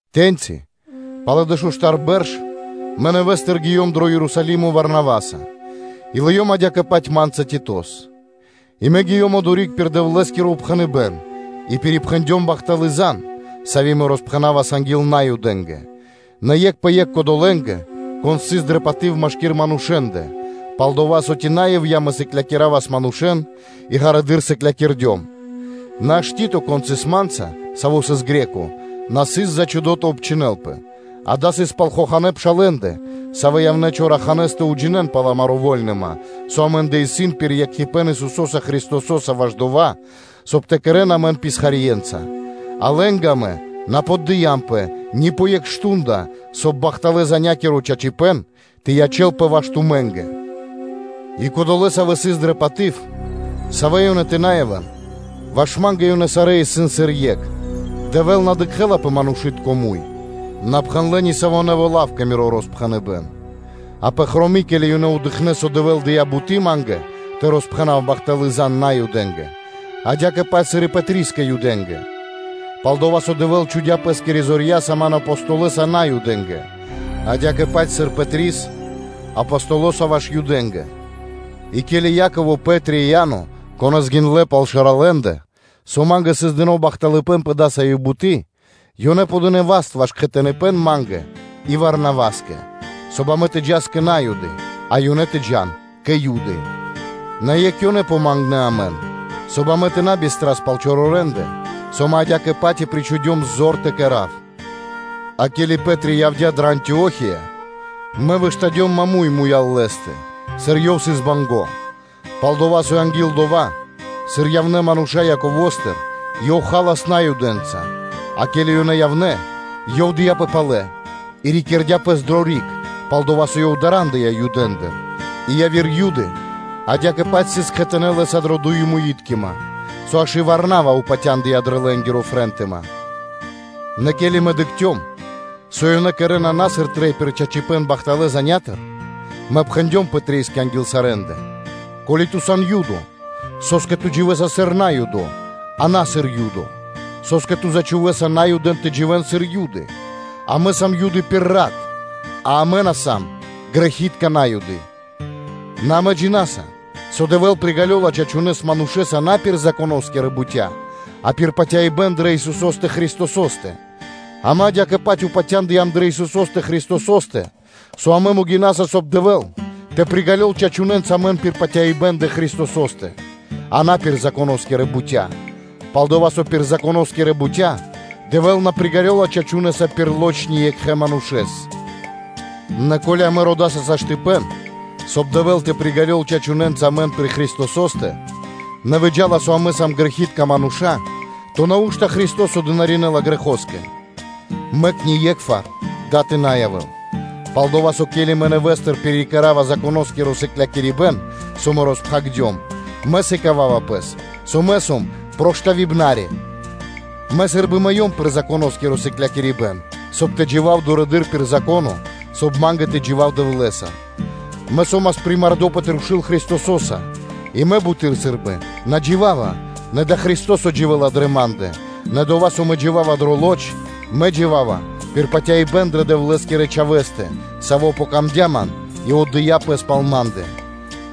Тэ́ньци пало́ дэшуштар бэрш мэ нэвэ́стыр гиём дро Ерусалимо Варнаваса, и лыём адя́кэ-паць ма́нца Титос; и мэ гиём одори́к пир Дэвлэ́скиро упхэныбэ́н и пирипхэндём бахталы́ зан (звесь), сави́ мэ роспхэнавас анги́л Наюдэ́ндэ, нэ екх пэ екх кодолэ́нгэ, кон сыс дрэ паты́в машки́р манушэ́ндэ, пал-дова́ со, ци на ивья́ (напра́снэс) мэ сыклякиравас манушэ́н и ґарэдыр сыклякирдём; нэ аж Тито, кон сыс ма́нца, саво́ сыс Гре́ко (Баламо́), на сыс зачхудо тэ обчхинэлпэ; дава́ сыс пал хоханэ́ пшалэ́ндэ, савэ́ явнэ́ чораханэ́с тэ уджинэ́н пал амари́ вольныма, со амэ́ндэ исын пир екхипэ́н Исусо́са Христосо́са ваш дова́, соб (кай) тэ кэрэ́н амэн писхарье́нца; а лэ́нгэ амэ на поддыямпэ, ни пэ екх мардоро (штундыца), соб (кай) бахталэ́-занякиро (звесякиро) чачипэ́н тэ ячэ́лпэ ваш тумэ́нгэ. И кодолэ́, савэ́ сыс дрэ паты́в, – савэ́ ёнэ тэ на явэ́н, – ваш ма́нгэ ёнэ сарэ́ исын сыр екх – Дэвэ́л на дыкхэ́ла пэ манушы́тко муй, – на пхэндлэ́ ни саво́ нэво́ лав кэ миро роспхэныбэн; а пэфроми (хроми), ке́ли ёнэ дыкхнэ́, со Дэвэ́л дыя́ буты́ ма́нгэ тэ роспхэнав бахталы́ зан (звесь) Наюдэ́нгэ, адя́кэ-паць сыр и Пэтрискэ Юдэ́нгэ; пал-дова́ со Дэвэ́л чхудя́ Пэ́скирэ зорья́са ман Апостолоса Наюдэ́нгэ, адя́кэ-паць сыр Пэтрис Апостолоса ваш Юдэ́нгэ, и ке́ли Яково, Пэ́три и Иа́но, конэ́с гиндлэ́ пал шэралэндэ, шундлэ́, со ма́нгэ сыс дыно́ бахталыпэ́н пэ дасави́ буты́, ёнэ подынэ васт ваш кхэтаныпэн ма́нгэ и Варнаваскэ, соб (кай) амэ тэ джас кэ На́юды, а ёнэ тэ джа́н кэ Юды; нэ екх ёнэ помангнэ амэн, соб (кай) амэ тэ на бистрас пал чорорэндэ, со мэ адя́кэ-паць и причхудём зор тэ кэра́в. А ке́ли Пэ́три явдя́ дрэ Антио́хия, мэ выштадём маму́й (проти) лэ́стэ, сыр ёв сыс банго́: пал-дова́ со анги́л дова́, сыр явнэ́ мануша́ Яковостыр, ёв халас Наюдэнца; а ке́ли ёнэ явнэ́, ёв дыяпэ палэ и рикирдя пэс дро риг, пал-дова́ со ёв дарандыя Юдэндыр; и яви́р Юды адя́кэ-паць сыс кхэтанэ́ лэ́са дрэ дуемуиткима, со аж и Варнава упатяндыя дрэ лэ́нгири фрэнтыма. Нэ ке́ли мэ дыкхцём, со ёнэ кэрэ́на на сыр трэй пир чачипэ́н бахталэ́ занятыр (звесятыр), мэ пхэндём Пэтрискэ анги́л сарэ́ндэ: “Ко́ли ту сан Юдо, со́скэ ту дживэса сыр Наюдо, а на сыр Юдо; со́скэ ту зачхувэса Наюдэн тэ дживэ́н сыр Юдэ́н?” Амэ сам Юды пир рат, а амэ на сам грэхи́тка На́юды, нэ амэ джина́са, со Дэвэ́л приґалёла чачунэса манушэ́с на пир Законо́скирэ бутя́, а пир патяибэ́н дрэ Исусо́стэ Христосо́стэ; амэ адя́кэ-паць упатяндыям дрэ Исусо́стэ Христосо́стэ, со амэ могинаса, соб (кай) Дэвэ́л тэ приґалёл чачунэнца амэн пир патяибэ́н дрэ Христосо́стэ, а на пир Законо́скирэ бутя́, пал-дова́ со пир Законо́скирэ бутя́ Дэвэ́л на приґалёла чачунэса пир лоч (плоть) ни екхэ манушэ́с. Нэ ко́ли амэ родаса саштыпэн (возможность/ваканцыя), соб (кай) Дэвэ́л тэ приґалёл чачунэнца амэн пир Христосо́стэ, нэ выджа́ла, со амэ сам грэхи́тка мануша́, то нау́што Христо́со дынаринэла грэхоскэ? Мэк ние́кхвар дава́ тэ на явэ́л! Пал-дова́ со, ке́ли мэ нэвэ́стыр пирикэрава Законоскиро сыклякирибэ́н, со мэ роспхагирдём, мэ сыкава́ва пэс, со мэ сом проштавибнари (преступнико). Мэ сы́рбы мыём пир Законоскиро сыклякирибэ́н, соб (кай) тэ джива́в дурэды́р пир Зако́но, соб (кай) ма́нгэ тэ джива́в Дэвлэ́са. Мэ со́мас примардо пэ трушу́л Христосо́са, и мэ буты́р сы́рбы на джива́ва, нэ дава́ Христо́со дживэ́ла дрэ ма́ндэ; нэ дова́, со мэ джива́ва дрэ лоч (плоть), мэ джива́ва пир патяибэ́н дрэ Дэвлэ́скирэ Чхавэ́стэ, Савэ́скэ яцём дро́го мэ, и Саво́ отдыя́ Пэс пал ма́ндэ.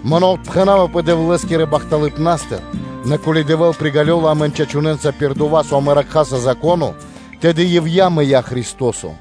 Мэ на отпхэнавапэ Дэвлэ́скирэ бахталыпнастыр, нэ, ко́ли Дэвэ́л приґалёла амэн чачунэнца пир дова́, со амэ ракхаса Зако́но, тэды ивья́ (напра́снэс) мыя́ Христо́со.